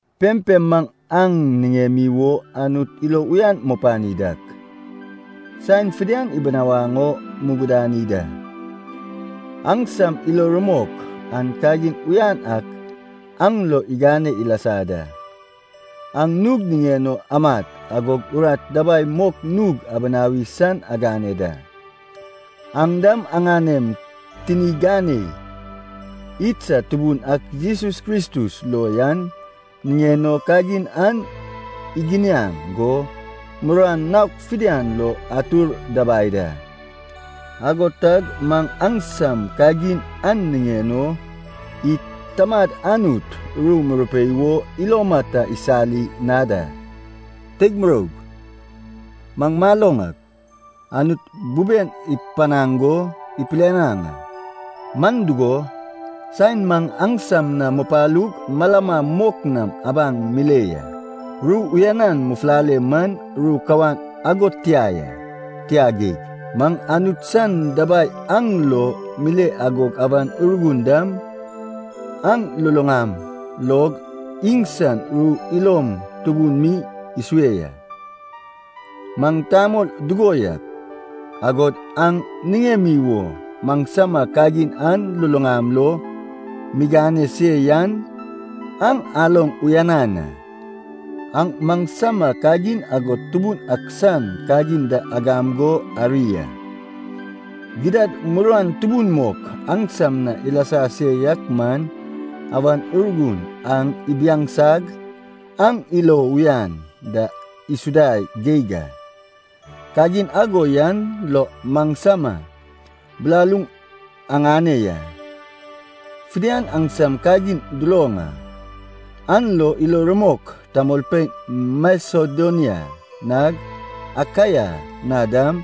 Pempem maŋ aŋ niŋemi wo Anut ilo uyan mupani dak, saen fidian ibinawaŋ o mugudani da. Aŋsam ilo rumok an kagin uyan ak aŋ lo igane ilasa da. Aŋ nug niŋen o amat agog urat dabai mok nug abinawi san agane da. Aŋ dam aŋanem tini ganei idsad Tubun ak Jesus Kristus lo yan niŋen o kagin an iginiaŋ go muruan naok fidian lo atur dabai da. Ago tag maŋ aŋsam kagin an niŋen o id Tamad Anut ru murupei wo iloma ta isali na da. Teig muroug, maŋ maloŋ ak, Anut buben ipanaŋ go ipilianaŋ a. Man dugo, saen maŋ aŋsam na mupalug malama mok nam abaŋ mile ya, ru uyanan mufulale man ru kawan ago tia ya. Tia geig, maŋ Anut san dabai aŋ lo mile agog Awan Urgun dam aŋ luluŋam log iŋsan ru ilom tubun mi isue ya. Maŋ tamol dugo yak, agod aŋ niŋemi wo maŋsama kagin aŋ luluŋam lo migane se yan aŋ aloŋ uyanan a. Aŋ maŋsama kagin agod Tubun ak san kagin da agam go ari a. Gidad muruan tubun mok aŋsam na ilasa se yak man Awan Urgun aŋ ibiaŋsag aŋ ilo uyan da isuda geig a. Kagin ago yan lo maŋsama bilaluŋ aŋane ya. Fidian aŋsam kagin duloŋ a. An lo ilo rumok tamolpein Masedonia nag Akaia na dam,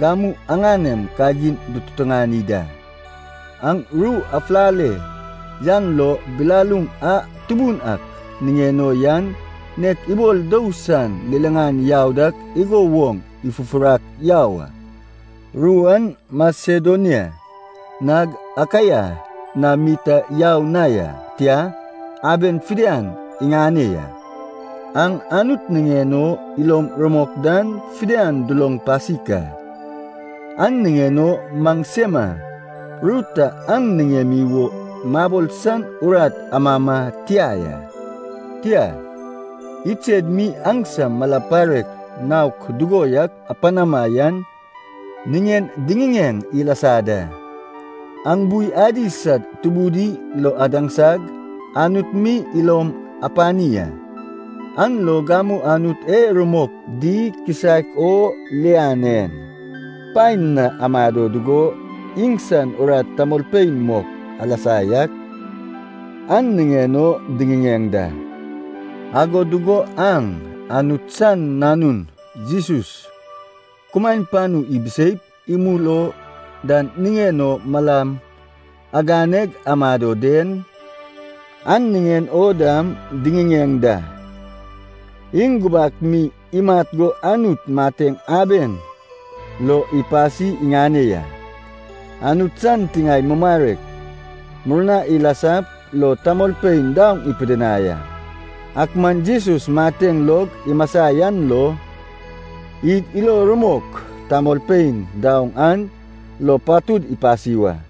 gamu aŋanem kagin dututuŋani da. Aŋ ru afulale yan lo, bilaluŋ a Tubun ak niŋen o yan, nek ibol dou san liliŋan yau dak igo woŋ ifufurak yau a. Ru an Masedonia nag Akaia na mi ta yau na ya, tia, aben fidian iŋane ya. Aŋ Anut niŋen o ilom rumok dan fidian duloŋ pasik a. An niŋen o maŋsema ru ta aŋ niŋemi wo mabol san urat amama tia ya. Tia, iŋsed mi aŋsam mala parek naok dugo yak apanama yan niŋen diŋiŋeŋ ilasa da. Aŋ bui adi sad tubudi lo adaŋsag, Anut mi ilom apani a. An lo gamu Anut e rumok di kisaek o lian en paen na amado dugo, iŋsan urat tamolpein mok alasa yak, an niŋen o diŋiŋeŋ da. Ago dugo aŋ, Anut san Nanun Jesus, kumaen panu ibiseip imul o dan niŋen o malam aganeg amado den, an niŋen o dam diŋiŋeŋ da. Iŋ gubak mi imat go Anut mateŋ aben lo ipasi iŋane ya. Anut san tiŋae mumarek murna ilasap lo tamolpein daoŋ ipidinai a, ak man Jesus mateŋ log imasa yan lo, id ilo rumok tamolpein daoŋ an lo patud ipasi wa.